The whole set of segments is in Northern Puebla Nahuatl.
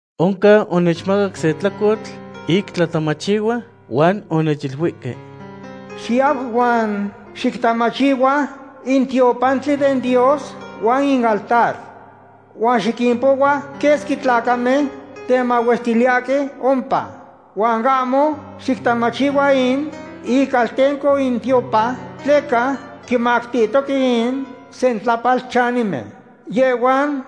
Oncan onechmacaque se tlacotl ic tlatamachihua huan onechiluihque: ―Xiyau huan xictamachihua in tiopantli den Dios huan in altar. Huan xiquimpohua quesqui tlacamen temahuestiliyahque ompa. Huan ahmo xictamachihua in icaltenco in tiopan, tleca quimactihtoque in sentlapalchanimen. Yehhuan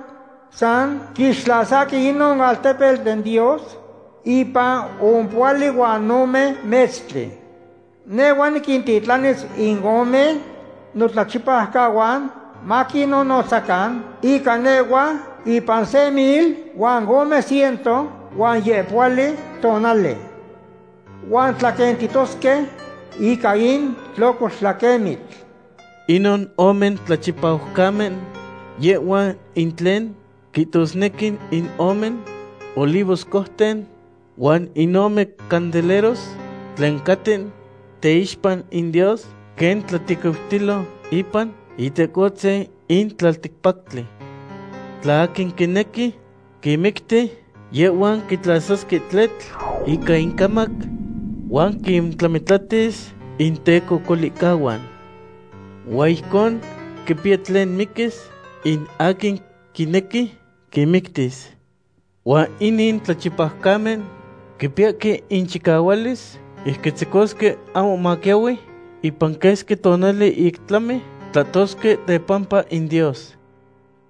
san quixtlasahque inon altepetl den Dios ipan ompohuali huan ome metztli. Nehhuatl niquintitlanis in ome notlachipaucahuan maquinnonotzacan ica nehhua ipan se mil huan ome ciento huan yehpohuali tonali. Huan tlaquentitosque ica in tlocoltlaquemitl. Inon ome tlachipaucamen yehhuan in tlen quihtosnequi in ome olivoscouten huan in ome candeleros tlen caten teixpa in Dios, quen tlatequiutilo ipan Itecohtzin in tlalticpactli. Tla aquin quinequi quinmicti, yehhuan quitlasasque tletl ica incamac huan quintlamitlatis intecocolihcahuan. Huan ijcon quipiya tlen miquis in aquin quinequi quinmictis. Huan inin tlachipaucamen quipiyahque inchicahualis ic quitzecosque ahmo maquiahui ipan quesqui tonali ic tlami tlahtosque tepampa in Dios.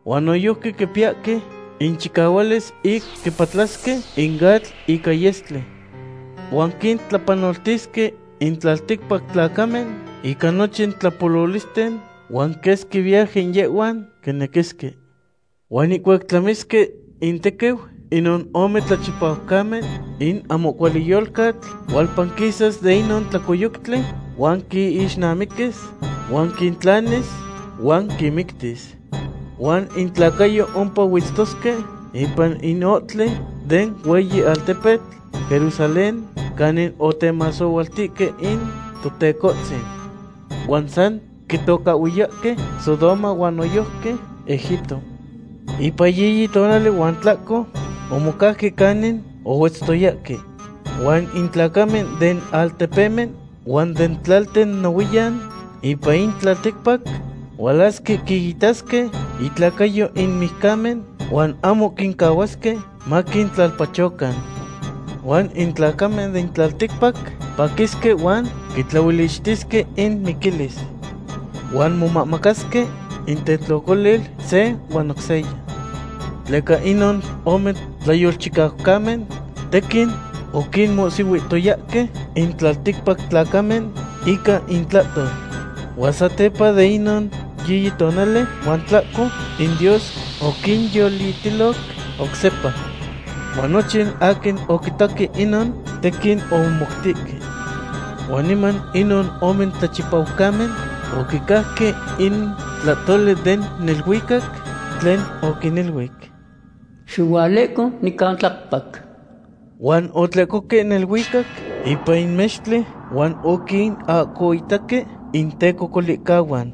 Huan noyojqui quipiyahque inchicahualis ic quipatlasque in atl ica yestli. Huan quintlapanoltisque in tlalticpac tlacamen ica nochin tlapololisten, huan quesqui viaje yehhuan quinequisque. Huan ihcuac tlamisque intequiu inon ome tlachipaucamen, in ahmo cuali yolcatl hualpanquisas de inon tlacoyoctli huan quinixnamiquis huan quintlanis huan quinmictis. Huan intlacayo ompa huetztosque ipan in ohtli den hueyi altepetl Jerusalén canin otemasohualtihque in Totecohtzin. Huan san quitocahhuiyahque Sodoma huan noyojqui Egipto. Ipan yiyi tonali huan tlahco omocauque canin ohuetztoyahque. Huan in tlacamen den altepemen huan den tlalten nohuiyan ipan in tlalticpac hualasque quinitasque intlacayo in mijcamen huan ahmo quincahuasque maquintlalpachocan. Huan in tlacamen den tlalticpac paquisque huan quitlaolichtisque inmiquilis. Huan momamacasque intetlocolil se huan oc seya. Tleca inon ome tlayolchicaucamen tequin oquinmohsihuihtoyahque in tlalticpac tlacamen ica intlahtol. Huan satepa ipan inon yiyi tonali huan tlahco, in Dios oquinyolitiloc oc sepa. Huan nochin aquin oquitaque inon, tequin omomoutihque. Huan niman inon ome tlachipaucamen oquicajque in tlahtoli den neluicac tlen oquiniluic: ―Xihualehco nican tlacpac. Huan otlehcohque neluicac ipan in mextli, huan oquinahcoitaque intecocolihcahuan.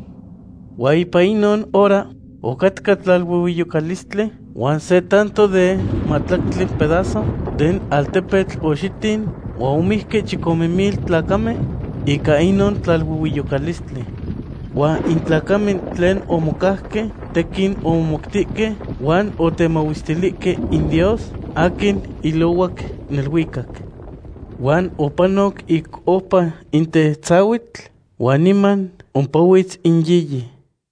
Huan ipan inon hora ocatca tlaluehueyocalistli huan se tanto den mahtlactli pedazo den altepetl oxitin huan omijque chicome mil tlacamen ica inon tlaluehueyocalistli. Huan in tlacamen tlen omocauque tequin omomoutihque huan otemahuestilihque in Dios aquin ilohuac neluicac. Huan opanoc ic oupa in tetzahuitl huan niman ompahuitz in yiyi.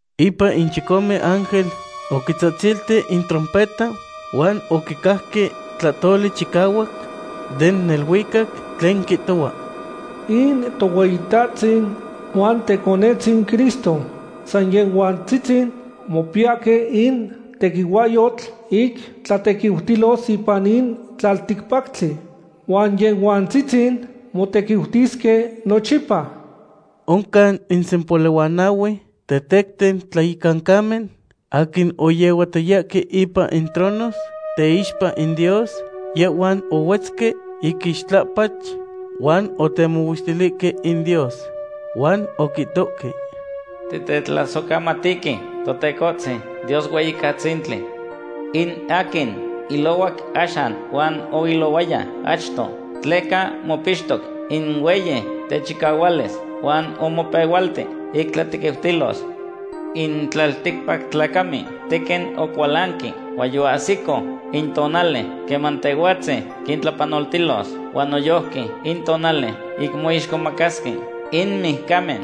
Ipan in chicome ángel oquitzahtzilti in trompeta huan oquicajque tlahtoli chicahuac den neluicac tlen quihtohua: In Tohueyitahtzin huan Teconetzin Cristo, san Yehhuantzitzin mopiyahque in tequihuahyotl ic tlatequiutilos ipan in tlalticpactli, huan Yehhuantzitzin motequiutisque nochipa. Oncan in sempohuali huan nahue tetecten tlayecancamen aquin oyehuatoyahque ipan in tronos teixpa in Dios, yehhuan ohuetzque ic ixtlapach huan otemahuestilihque in Dios. Huan oquihtohque: Titetlasohcamatihque, Totecohtzin, Dios Hueyicatzintli, in aquin ilohuac axan huan oilohuaya achto, tleca mopixtoc in hueyi techicahualis huan omopehualti ic tlatequiutilos. In tlalticpac tlacamen tequin ocualanque, huan yoahsico in tonali queman Tehhuatzin quintlapanoltilos, huan noyojqui in tonali ic moixcomacasque in mijcamen.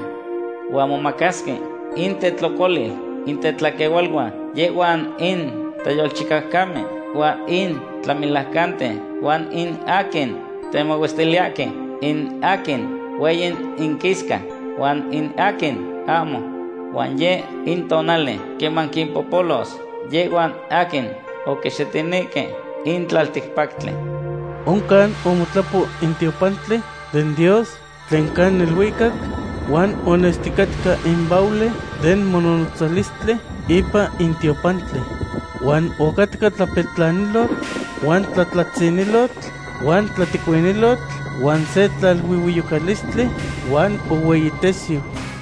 Huan momacasque intetlocolil in tetlaquehualuan, yehhuan in tlayolchicaucamen huan in tlamelaucanten, huan in aquin temahuestiliyahque, in aquin hueyi inquisca huan in aquin ahmo. Huan yeh in tonali queman quimpololos yehhuan aquin oquixitinihque in tlalticpactli. Oncan omotlapo in tiopantli den Dios tlen ca neluicac, huan onesticatca in baule den mononotzalistli ipan in tiopantli. Huan ocatca tlapetlanilotl, huan tlatlatzinilotl, huan tlatecuinilotl, huan se tlaluehueyocalistli huan ohueyitesiu.